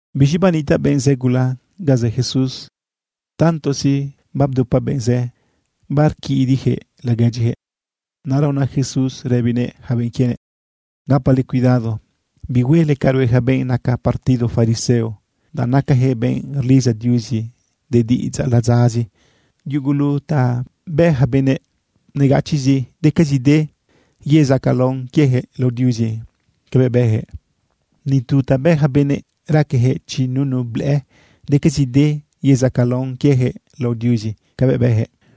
Biz̃i banitaꞌ benꞌ zë gula ga zë Jesús. Tantozi babdupa benꞌ zë, barquidiꞌyaquëꞌ laguedyiyaquëꞌ. Naꞌra una Jesús rëbinëꞌ yaca benꞌ quienëꞌ: ―Gapale cuidado bihuele ca rue yaca benꞌ naca partido fariseo, danꞌ nacayaquëꞌ benꞌ rlidza Diuzi de diꞌidzaꞌ ladzazi. Yugulu ta bë yaca benëꞌ negachiꞌzi, decazide yezacalaon quieyaquëꞌ lao Diuzi cabëꞌ bëyaquëꞌ. Ni tu ta bë yaca benëꞌ raqueyaquëꞌ chi nunu blëꞌë, decazide yezacalaon quieyaquëꞌ lao Diuzi cabëꞌ bëyaquëꞌ.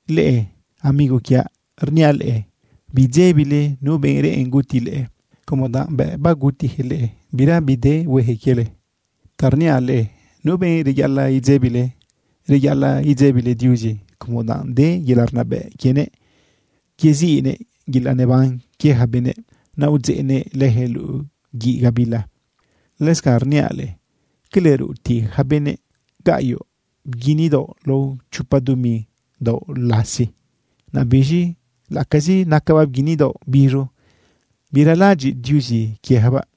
―Leꞌe amigo quiaꞌ, rniaꞌ leꞌe: Biidzebile nu benꞌ reꞌen guti leꞌe, como danꞌ bëꞌ bagutiyaquëꞌ leꞌe, bira bide bihueyaquëꞌ quiele. Ta rniaꞌ leꞌe nu benꞌ reyaꞌalaꞌ idzebile. Reyaꞌalaꞌ idzebile Diuzi como danꞌ de yelaꞌ rnabëꞌ quienëꞌ yeziꞌnëꞌ yelaꞌ neban quie yaca benëꞌ, naꞌ udzeꞌnëꞌ leyaquëꞌ luꞌu guiꞌ gabila. ’Lëscanꞌ rniaꞌ leꞌe: ¿Cala rutiꞌyaca benëꞌ gaꞌyoꞌ bguini daoꞌ lao chopa dumi daoꞌ lasi? Naꞌ biz̃i laꞌacazi nacabaꞌ bguini daoꞌ biz̃u, biralaꞌadyiꞌ Diuzi quieyacabaꞌ.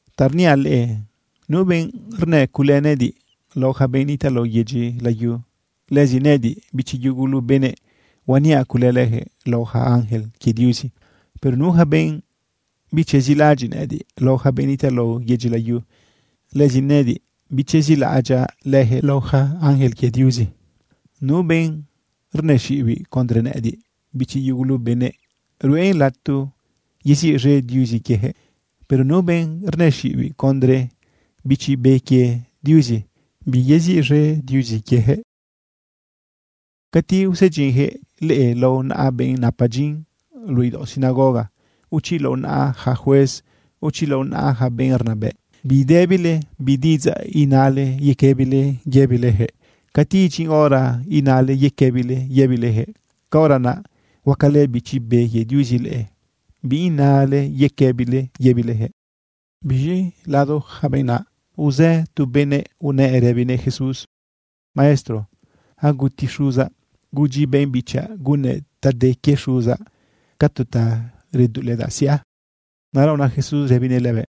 ―Ta rniaꞌ leꞌe, nu benꞌ rnë cule nëꞌëdiꞌ lao yaca benꞌ nitaꞌ lao yedyi layu, lëzi nëꞌëdiꞌ, bichi yugulu benëꞌ, huaniaꞌ cule leyaquëꞌ lao yaca ángel quie Diuzi. Pero nu yaca benꞌ bichezilaꞌadyiꞌ nëꞌëdiꞌ lao yaca benꞌ nitaꞌ lao yedyi layu, lëzi nëꞌëdiꞌ bichezilaꞌadyaꞌ leyaquëꞌ lao yaca ángel quie Diuzi. ’Nu benꞌ rnëxiꞌibiꞌ condre nëꞌëdiꞌ, bichi yugulu benëꞌ, ruꞌen lato yeziꞌz̃e Diuzi quieyaquëꞌ. Pero nu benꞌ rnëxiꞌibiꞌ condre Bichi Be quie Diuzi, biyeziꞌz̃e Diuzi quieyaquëꞌ. ’Cati usedyinyaquëꞌ leꞌe lao naꞌa benꞌ napa dyin luꞌu idaoꞌ sinagoga, o chi lao naꞌa yaca juez, o chi lao naꞌa yaca benꞌ rnabëꞌ, bidëbile bi diꞌidzaꞌ inale yequëbile yëbileyaquëꞌ. Cati idyin hora inale yequëbile yëbileyaquëꞌ, caora naꞌ huacalë Bichi Be quie Diuzi leꞌe bi inale yequëbile yëbileyaquëꞌ. Biz̃i lado yaca benꞌ naꞌ, uzë tu benëꞌ unëꞌ rëbinëꞌ Jesús: ―Maestro, aguti xuzaꞌ. Gudyi benꞌ bichaꞌ gunnëꞌ ta de quie xuzaꞌ ca tu ta reduꞌuledaꞌ siꞌa. Naꞌra una Jesús rëbinëꞌ lëbëꞌ: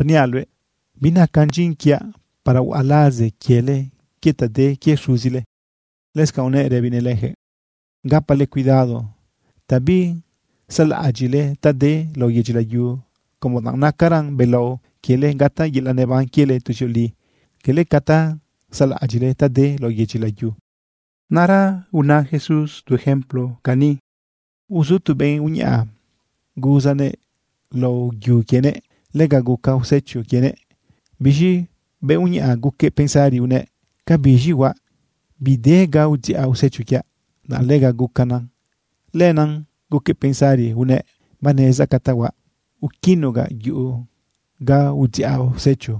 ―Rniaꞌ luëꞌ, binacan dyin quiaꞌ para huaꞌa laze quiele quie ta de quie xuzile. Lëscanꞌ unëꞌ rëbinëꞌ leyaquëꞌ: ―Gapale cuidado ta bisaꞌlaꞌadyiꞌle ta de lao yedyi layu, como danꞌ nacaran belao quiele gataꞌ yelaꞌ neban quiele tuzioli, cala ca ta saꞌlaꞌadyiꞌle ta de lao yedyi layu. Naꞌra una Jesús tu ejemplo cani: ―Uzu tu benꞌ uñaꞌa. Guzanëꞌ lao yu quienëꞌ. Lega guca usecho quienëꞌ. Biz̃i benꞌ uñaꞌa guquëꞌ pensari unëꞌ: “¿Ca biz̃i huaꞌ? Bide ga udziꞌa usecho quiaꞌ, danꞌ lega gucana.” Lenaꞌ guquëꞌ pensari unëꞌ: “Banezdaꞌ ca ta huaꞌ. Uquinugaꞌ yuꞌu ga udziꞌa usecho,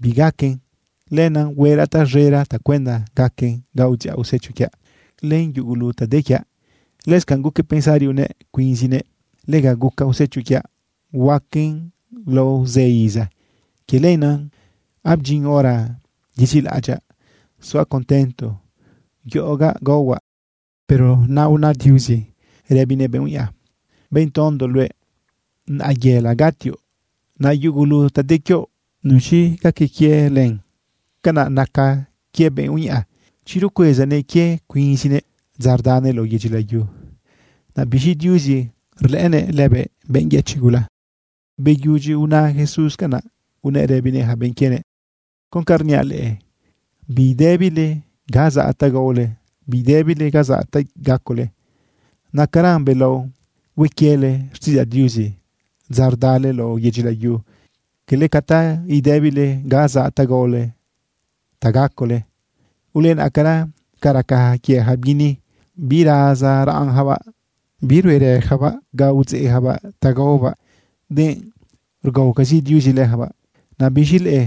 bigaquen. Lenaꞌ hueraꞌ taz̃era tacuenda gaquen ga udziꞌa usecho quiaꞌ len yugulu ta de quiaꞌ.” Lëscanꞌ guquëꞌ pensari unëꞌ cuinzinëꞌ: “Lega guca usecho quiaꞌ. Huaquen lao zë iza. Quie lenaꞌ abdyin hora yezilaꞌadyaꞌ, zuaꞌ contento, yoꞌogaꞌ, gaohuaꞌ.” Pero naꞌ una Diuzi rëbinëꞌ benꞌ uñaꞌa: “Benꞌ tondo luëꞌ, naꞌayela gatioꞌ. Naꞌ yugulu ta de quioꞌ, ¿nuz̃i gaca quie len?” Canaꞌ nacan quie benꞌ uñaꞌa chi rcuezanëꞌ quiëꞌ cuinzinëꞌ dza rdanëꞌ lao yedyi layu. Naꞌ biz̃i Diuzi rlëꞌënëꞌ lëbëꞌ benꞌ yëchiꞌ gula. Beyudyi una Jesús canaꞌ, unëꞌ rëbinëꞌ yaca benꞌ quienëꞌ: ―Con ca rniaꞌ leꞌe, bidëbile ga zaꞌ ta gaole. Bidëbile ga zaꞌ ta gacole. Nacaran belao hue quiele xtiꞌidzaꞌ Diuzi dza rdale lao yedyi layu, cala ca ta idëbile ga zaꞌ ta gaole, ta gacole. Ulenaꞌcara ca raca quie yaca bguini. Birazaraꞌnyacabaꞌ, biruerëyacabaꞌ ga udzeꞌyacabaꞌ ta gaobaꞌ, denꞌ rgaocazi Diuzi leyacabaꞌ. Naꞌ biz̃i leꞌe,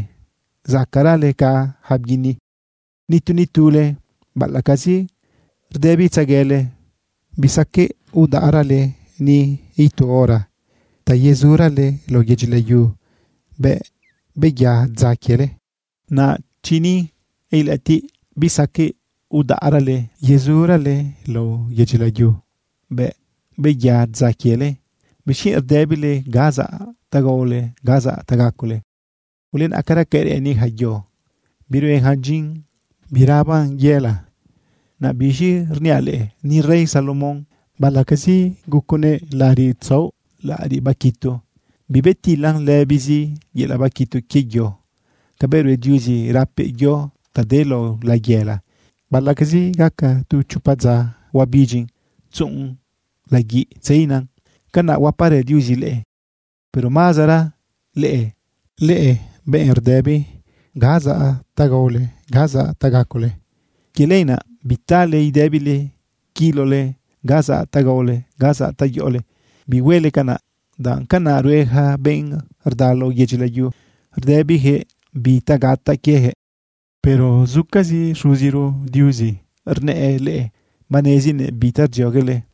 ¡zacaꞌrale ca yaca bguini! Nitu nitule, baꞌalaꞌcazi rdëbitzeguele, bisaqueꞌ udaꞌrale ni itu hora ta yezurale lao yedyi layu bëꞌ beya dza quiele. Naꞌ chi ni ilëꞌëtiꞌ bisaqueꞌ udaꞌrale yezurale lao yedyi layu bëꞌ beya dza quiele, ¿bixquienꞌ rdëbile ga zaꞌ ta gaole, ga zaꞌ ta gacole? ’Ulenaꞌcara ca reꞌeni yaca yo. Birueyacan dyin, biraꞌaban yëla. Naꞌ biz̃i rniaꞌ leꞌe, ni rey Salomón, baꞌalaꞌcazi guconëꞌ laꞌariꞌ tzaoꞌ, laꞌariꞌ baquitu, bibetilan lëbizi yelaꞌ baquitu quie yo. Cabëꞌ rue Diuzi rapëꞌ yo ta de lao layëla, baꞌalaꞌcazi gaca tu chopa dza huabidyin tzuꞌun laguiꞌ tzeina, canaꞌ huaparë Diuzi leꞌe, pero mazara leꞌe, benꞌ rdëbi ga zaꞌ ta gaole, ga zaꞌ ta gacole. Quie lenaꞌ, bitale idëbile quilole ga zaꞌ ta gaole, ga zaꞌ ta yoꞌole. Bihuele canaꞌ, danꞌ canaꞌ rue yaca benꞌ rda lao yedyi layu, rdëbiyaquëꞌ bi ta gataꞌ quieyaquëꞌ. Pero zucazi Xuziro Diuzi, rnëꞌë leꞌe, banezinëꞌ bi ta rdzioguele.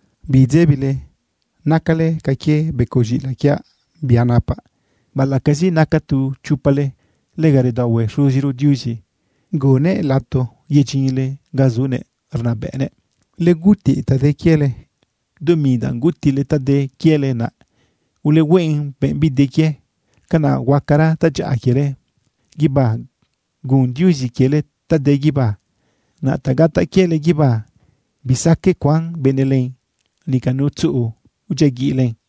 ―Bidzebile, nacale ca quie becoꞌ z̃iꞌilaꞌ quiaꞌ, bia napaꞌ. Baꞌalaꞌcazi naca tu chopale, lega redaohue Xuziro Diuzi gunnëꞌ lato yedyinle ga zunëꞌ rnabëꞌnëꞌ. Ulegutiꞌ ta de quiele. Dumi danꞌ gutiꞌle ta de quiele, naꞌ ulehueꞌn benꞌbide quie. Canaꞌ huacara tadyaꞌa quiele guibá, gun Diuzi quiele ta de guibá. Naꞌ ta gataꞌ quiele guibá, bisaqueꞌ cuan benëꞌ len, nica nu tzuꞌu udyiaguiꞌ len.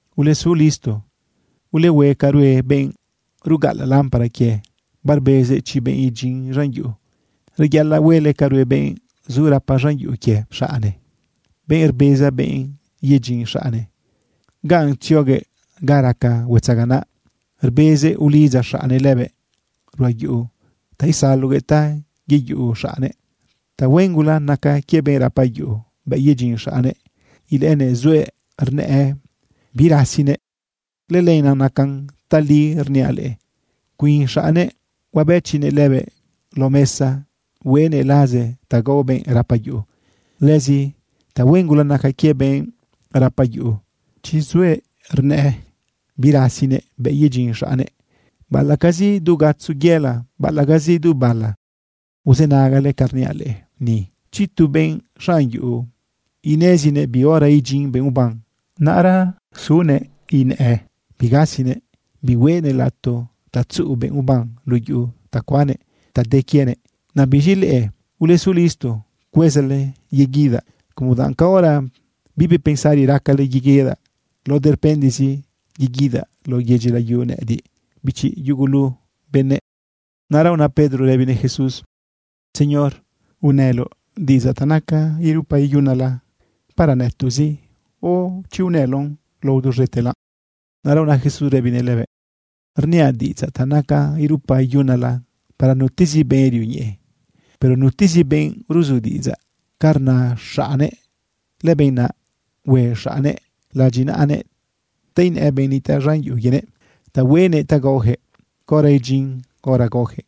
―Ulesu listo, ulehue ca rue benꞌ rugaꞌalaꞌ lámpara quie, barbezëꞌ chi benꞌ idyin z̃an yuꞌu. Reyaꞌalaꞌ huele ca rue benꞌ zu rapa z̃an yuꞌu quie xaꞌne, benꞌ rbeza bëꞌ yedyin xaꞌnnëꞌ ganꞌ tzioguëꞌ ga raca huetzaganaꞌ. Rbezëꞌ ulidza xaꞌnnëꞌ lëbëꞌ ruꞌa yuꞌu ta isaloguëꞌ ta yeyuꞌu xaꞌnnëꞌ. Tahuen gula naca quie benꞌ rapa yuꞌu bëꞌ yedyin xaꞌnnëꞌ, ilëꞌënëꞌ zuëꞌ, rnëꞌë birasinëꞌ. Lëlenaꞌ nacan tali rniaꞌ leꞌe, cuin xaꞌnnëꞌ huabëchinëꞌ lëbëꞌ lao mesa, hueꞌnëꞌ laze ta gao benꞌ rapa yuꞌu. Lëzi tahuen gula naca quie benꞌ rapa yuꞌu chi zuëꞌ rnëꞌë birasinëꞌ bëꞌ yedyin xaꞌnnëꞌ, baꞌalaꞌcazi du gatzo yela, baꞌalaꞌcazi du bala. Uzënagale ca rniaꞌ leꞌe ni. Chi tu benꞌ xanꞌ yuꞌu ineziguëꞌ bi hora idyin benꞌ uban, naꞌra sunëꞌ inëꞌë bigasinëꞌ, bihuëꞌnëꞌ lato ta tzuꞌu benꞌ uban luꞌu yuꞌu ta cuannëꞌ ta de quienëꞌ. Naꞌ biz̃i leꞌe, ulesu listo cuezale yeguidaꞌ, como danꞌ caora bibi pensari racale yeguidaꞌ, lao durpendizi yeguidaꞌ lao yedyi layu nëꞌëdiꞌ, bichi yugulu benëꞌ. Naꞌra una Pedro rëbinëꞌ Jesús: ―¿Señor, unëloꞌ diꞌidzaꞌ ta nacan irupa iyunala para nëtoꞌzi o chi unëloꞌn lao duz̃etela? Naꞌra una Jesús rëbinëꞌ lëbëꞌ: ―Rniaꞌ diꞌidzaꞌ ta nacan irupa iyunala para nutezi benꞌ rioñeꞌe, para nutezi benꞌ ruzu diꞌidzaꞌ ca rna xaꞌnnëꞌ. Lëbenꞌ naꞌ hue xaꞌnnëꞌ ladyinaꞌanëꞌ ta inëꞌë benꞌ nitaꞌ z̃an yuꞌu quienëꞌ ta hueꞌnëꞌ ta gaoyaquëꞌ caora idyin hora gaoyaquëꞌ.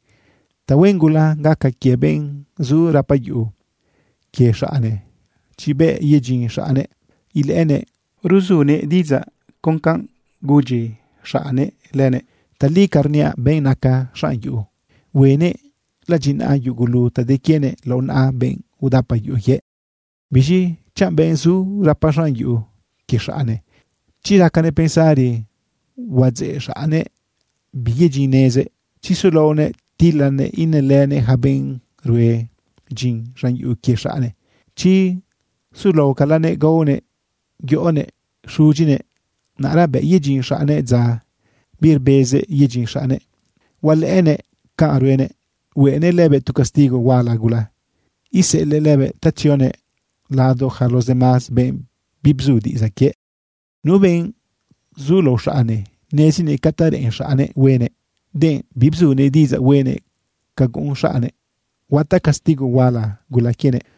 Tahuen gula gaca quie benꞌ zu rapa yuꞌu quie xaꞌnnëꞌ, chi bëꞌ yedyin xaꞌnnëꞌ ilëꞌënëꞌ rzuguëꞌ diꞌidzaꞌ con canꞌ gudyinëꞌ xaꞌnnëꞌ lëbëꞌ. Tali ca rniaꞌ, benꞌ naca xanꞌ yuꞌu, hueꞌnëꞌ ladyinaꞌa yugulu ta de quienëꞌ lao naꞌa benꞌ udapa yuꞌu quiëꞌ. Biz̃i chanꞌ benꞌ zu rapa z̃an yuꞌu quie xaꞌnnëꞌ, chi racanëꞌ pensari huadzë xaꞌnnëꞌ biyedyinnezëꞌ, chi sulaonëꞌ tilalënëꞌ inëlënëꞌ yaca benꞌ rue dyin z̃an yuꞌu quie xaꞌnnëꞌ, chi sulaocalanëꞌ gaonëꞌ yoꞌonëꞌ xudyinëꞌ, naꞌra bëꞌ yedyin xaꞌnnëꞌ dza birbezëꞌ yedyin xaꞌnnëꞌ, hualëꞌënëꞌ canꞌ ruenëꞌ, huenëꞌ lëbëꞌ tu castigo huala gula, iseꞌelëꞌ lëbëꞌta tzionëꞌ lado yaca los demás benꞌ bibzu diꞌidzaꞌ quiëꞌ. ’Nu benꞌ zu lao xaꞌnnëꞌ nezinëꞌ ca ta reꞌen xaꞌnnëꞌ huenëꞌ, denꞌ bibzunëꞌ diꞌidzaꞌ huenëꞌ ca guꞌun xaꞌnnëꞌ, huataꞌ castigo huala gula quienëꞌ.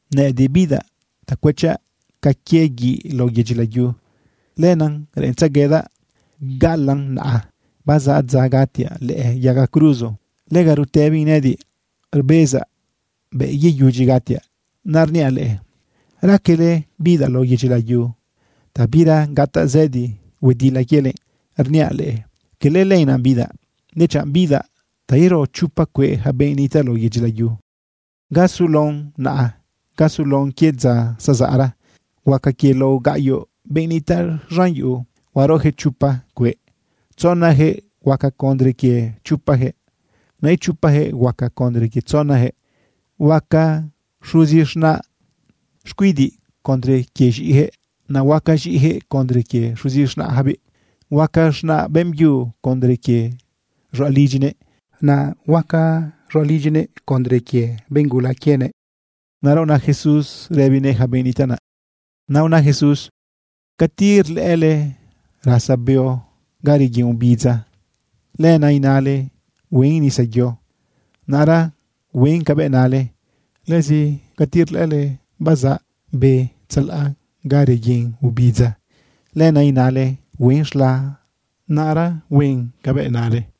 ―Nëꞌëdiꞌ bidaꞌ ta cuëchaꞌ ca quie guiꞌ lao yedyi layu. Lenaꞌ reꞌentzeguedaꞌ gaꞌalaꞌn naꞌa. Bazaꞌ dza gatiaꞌ lëꞌë yaga cruzo. Lega rutëbin nëꞌëdiꞌ rbezaꞌ bëꞌ yeyudyi gatiaꞌ. Naꞌ rniaꞌ leꞌe, ¿raquele bidaꞌ lao yedyi layu ta bira gataꞌ zëdi huedila quiele? Rniaꞌ leꞌe, cala lenaꞌ bidaꞌ, dechanꞌ bidaꞌ ta iro chopa cueꞌ yaca benꞌ nitaꞌ lao yedyi layu. Ga sulaon naꞌa, ga sulaon quie dza zazaꞌra. Huaca quie lao gaꞌyoꞌ benꞌ nitaꞌ z̃an yuꞌu, huaroyaquëꞌ chopa cueꞌ. Tzonayaquëꞌ huaca condre quie chopayaquëꞌ. Naꞌ ichopayaquëꞌ huaca condre quie tzonayaquëꞌ. Huaca xuzi z̃naꞌ xcuidiꞌ condre quie z̃iꞌiyaquëꞌ. Naꞌ huaca z̃iꞌiyaquëꞌ condre quie xuzi z̃naꞌyacabiꞌ. Huaca z̃naꞌ beꞌmbyu condre quie z̃ualidyinëꞌ. Naꞌ huaca z̃ualidyinëꞌ condre quie benꞌ gula quiebiꞌ. Naꞌra una Jesús rëbinëꞌ yaca benꞌ nitaꞌ naꞌ: ―Cati rlëꞌële rasa beo ga reguin obidza, lenaꞌ inale huen nisayo, naꞌra huen cabëꞌ nale. Lëzi cati rlëꞌële bazaꞌ be tzalaꞌ ga reguin obidza, lenaꞌ inale huen z̃la, naꞌra huen cabëꞌ nale.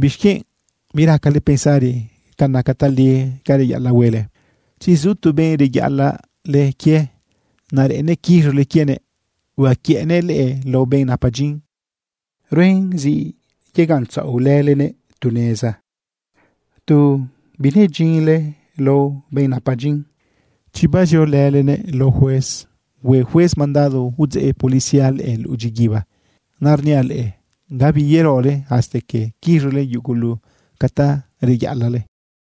―¿Bixquienꞌ biracale pensari ca naca tali ca reyaꞌalaꞌ huele? Chi zu tu benꞌ reyaꞌalaꞌle quie, naꞌ reꞌennëꞌ quiz̃ole quienëꞌ uquiëꞌnëꞌ leꞌe lao benꞌ napa dyin, ruen zi yegaꞌntzaꞌole laonëꞌ tu neza tu binedyinle lao benꞌ napa dyin. Chi baziolëlenëꞌ lao juez, hue juez mandado udzeꞌ policía leꞌe luꞌu dyiguiba. Naꞌ rniaꞌ leꞌe, gabi yerole hasta que quiz̃ole yugulute ca ta reyaꞌalaꞌle.